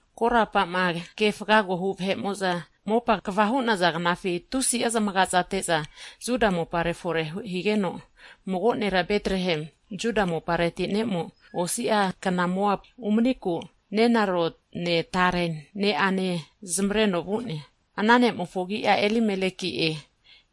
Korapa'ma keaga refakohu vahe'mo'za (jasi) mopa kva hu'naza knafi, tusi'a zamagate'za Juda mopare fore higeno, mago nera Betlehemu, Juda mopareti ne'mo, osi'agna Moapu umaniku nenarone, tare ne'ane zamavareno vu'ne. Ana ne'mofo agi'a, Elimeleki'e,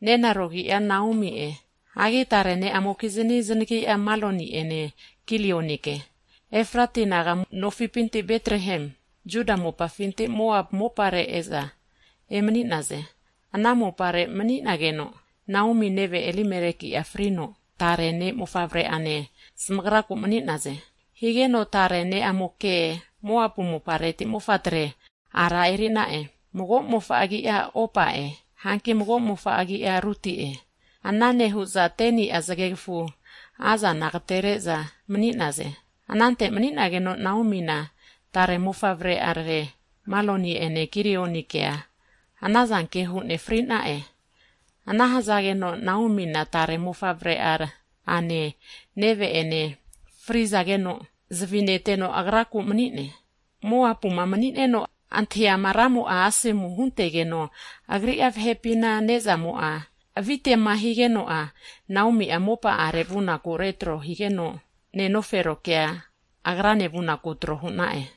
nenaro agi'a Naomi'e, hagi tare ne'amokizni znagi'a, Maloni'ene, Kilionike. Efrata naga nofipintira Betlehemu Juda mopafinti Moab mopare e'za emani'naze. Ana mopare mani'nageno, Naomi neve, Elimeleki'a frigeno, Naomi'a tare ne'mofavre'ane zamagraku mani'naze. Higeno tare ne'amokea Moapu mopareti mofatre ara eri'na'e. Mago'mofo agi'a, Opa'e, hanki mago'mofo agi'a Ruti'e. Ana nehu'za 10i'a Zagegafu naza anantega mani'naze. Anante mani'nageno Naomina, tare mofavre'a Maloni'ene, Kilionikea anazanke hu'ne fri'na'e. Ana hzageno, Naomina, tare mofavre'ane, neve'ene, fri'zageno, zavi neteno agraku mani'ne! Moapuma mani'neno antahiama Ramo'a asomu huntegeno, agri'a vahepina ne'zamo'a avitema higeno'a, Naomi'a mopa'are vunaku retro nehigeno, nenoferokea, agrane vunaku tro hu'na'e.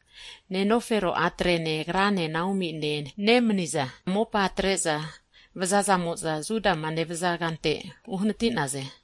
Nenofero a'trene, agrane (Naomi) nemaniza mopa atre'za vu'za Judama nevaza kante uhanati'naze.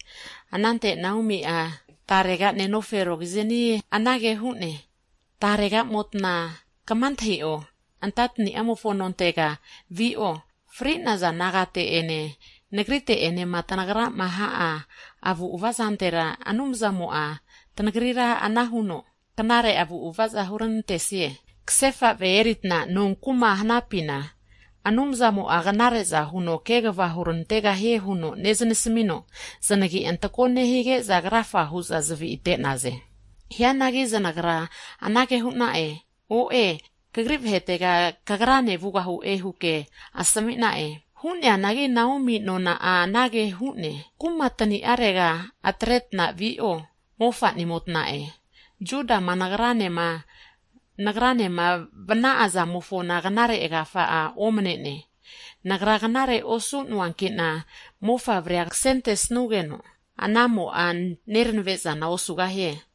Anante Naomi'a tarega nenoferokiznigu anage hu'ne, Taregamotna'a kama antahi'o, antatani'amofo nontega vi'o. Fri'naza nagate'ene, nagrite'enema tanagrama ha'a avu'ava zantera, Anumzamo'a tanagrira ana huno knare avu'ava huranantesie. Kasefa ve eritna nonkuma huta manisapina Anumzamo'a knare'za huno kegava huranantegahie huno neznasmino, zanagi antako nehige'za krafa hu'za zavi ate'naze. Hianagi zanagra anage hu'na'e. O'e, tagra kagri vahetega kagrane vugahu'e, huke asmi'na'e. Hu'neanagi, Naomi'a kenonazni'a anage hu'ne, Kuma tani'arega etetna vi'o, mofa'nimotna'a, Judama nagranema vana'a zamofona knare kegafa omane'ne. Nagra knare osu'noanki'na, mofavrea kasentesnugeno, ana mofavremo'a nernave zana osugahie.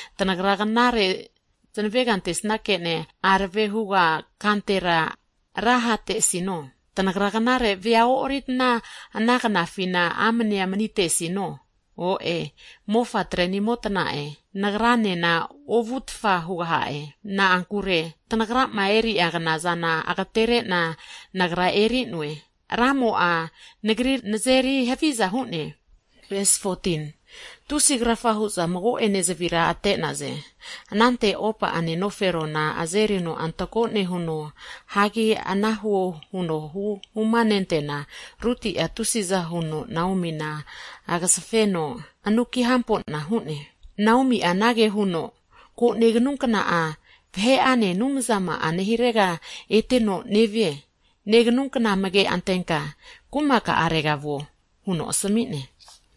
tanagra knare zanavega ante'nesanke'ne, arave huga kantera ra hate'sino? Tanagra knare vea e'oritna ana kna'afina amnea mani'tesino? O'e, mofa'trenimotna'e, nagranena ovu tfaza hugaha'e. Na'ankure tanagrama eri'a knazana agtere'na nagra eri'noe, Ramo'a nagrira nazeri haviza hu'ne. Tusi krafa hu'za mago'ene zavira ate'naze. Anante Opa'a nenoferona azerino antako nehuno ete vu'ne. Hianagi ana huo huno huma nenteana, Ruti'a tusi'za huno Naomina agzafeno anuki hampo'na hu'ne. Naomi'a anage hu'ne, Ko, neganunkna'a, vahe'ane, anumzama'a nehirega eteno nevie. Neganunkna amage antenka kumaka'arega vuo, huno asmi'ne.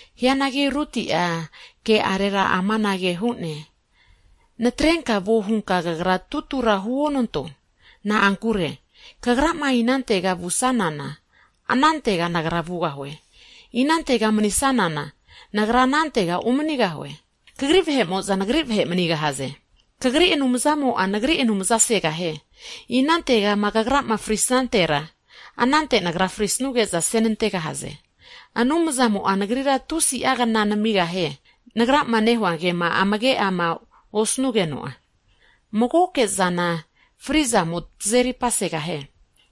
Hianagi Ruti'a ke'arera amanage hu'ne, Natrenka vuo hunka kagra tutura huonanto. Na'ankure, kagrama inantega vusanana, anantega nagra vugahue. Inante manisanana, nagra anante umanigahu'e. Kagri vahe'mo'za, nagri vahe manigahaze. Kagri Anumzamo'a, nagri Anumza segahie. Inante'ma kagrama fri snantera, anante nagra frisnuge'za ase nantegahaze. Anumzamo'a nagrira tusi'a kna namigahie, nagrama nehua kema amage'ma osnugeno'a, magoke'zana fri'zamoke tazeri pasegahie.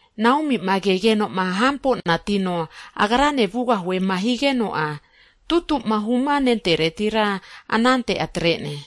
Naomi'ma kegeno Ruti'ma hampo'natino agrane vugahue'ma higeno'a, tutu'ma huno'ma huma nenteretira anante atre'ne.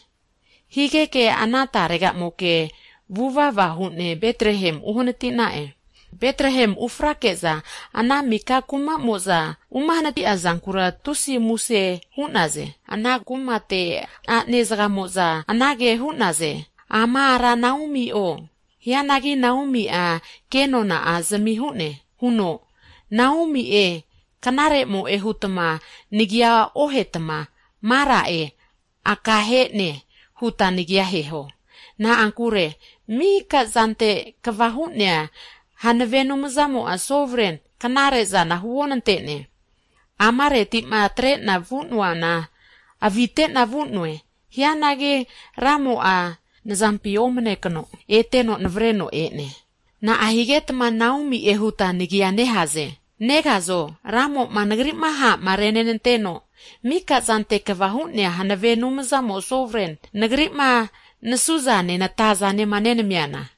Higeke ana tarega'moke vuvava hu'ne Betlehem uhanatina'e. Betlehemi ufrake'za, ana kumapi miko vahe'mo'za uma hnatina'a zankura tusi muse hu'naze. Ana nehu'za kumate a'ne zagamo'za anage hu'naze, Ama ara Naomio? Hianagi, Naomi'a ke nonazmi huno, Naomi'e (knaremo'e) hutma nagia ohetma, Mara'e (aka he'ne) huta nagia aheho, na'ankure Miko'zante Kva Hu'nea Hanave Anumzamo (Sovren) knare'zana huonante'ne. Amareti'ma atre'na vu'noana maka'zampina avite'na vu'noe, hianagi Ramo'a nazampi omane kno eteno navareno e'ne. Na'a higetma Naomi'e huta nagia nehaze, negazo Ramo'ma nagri'ma ha'ma renenanteno, Miko'zante Kva Hu'nea Hanave Anumzamo (Sovren) nagri'ma nasuzane, natazama nenamiana?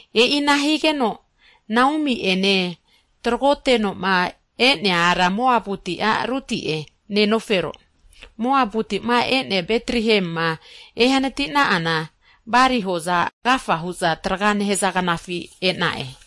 E'ina higeno, Naomi'a nenofero Moabuti a' Ruti'e. Moabuti'ma Betlehemima ehanati na'ana, bali hoza agafa hu'za traga nehaza knafi e'na'e.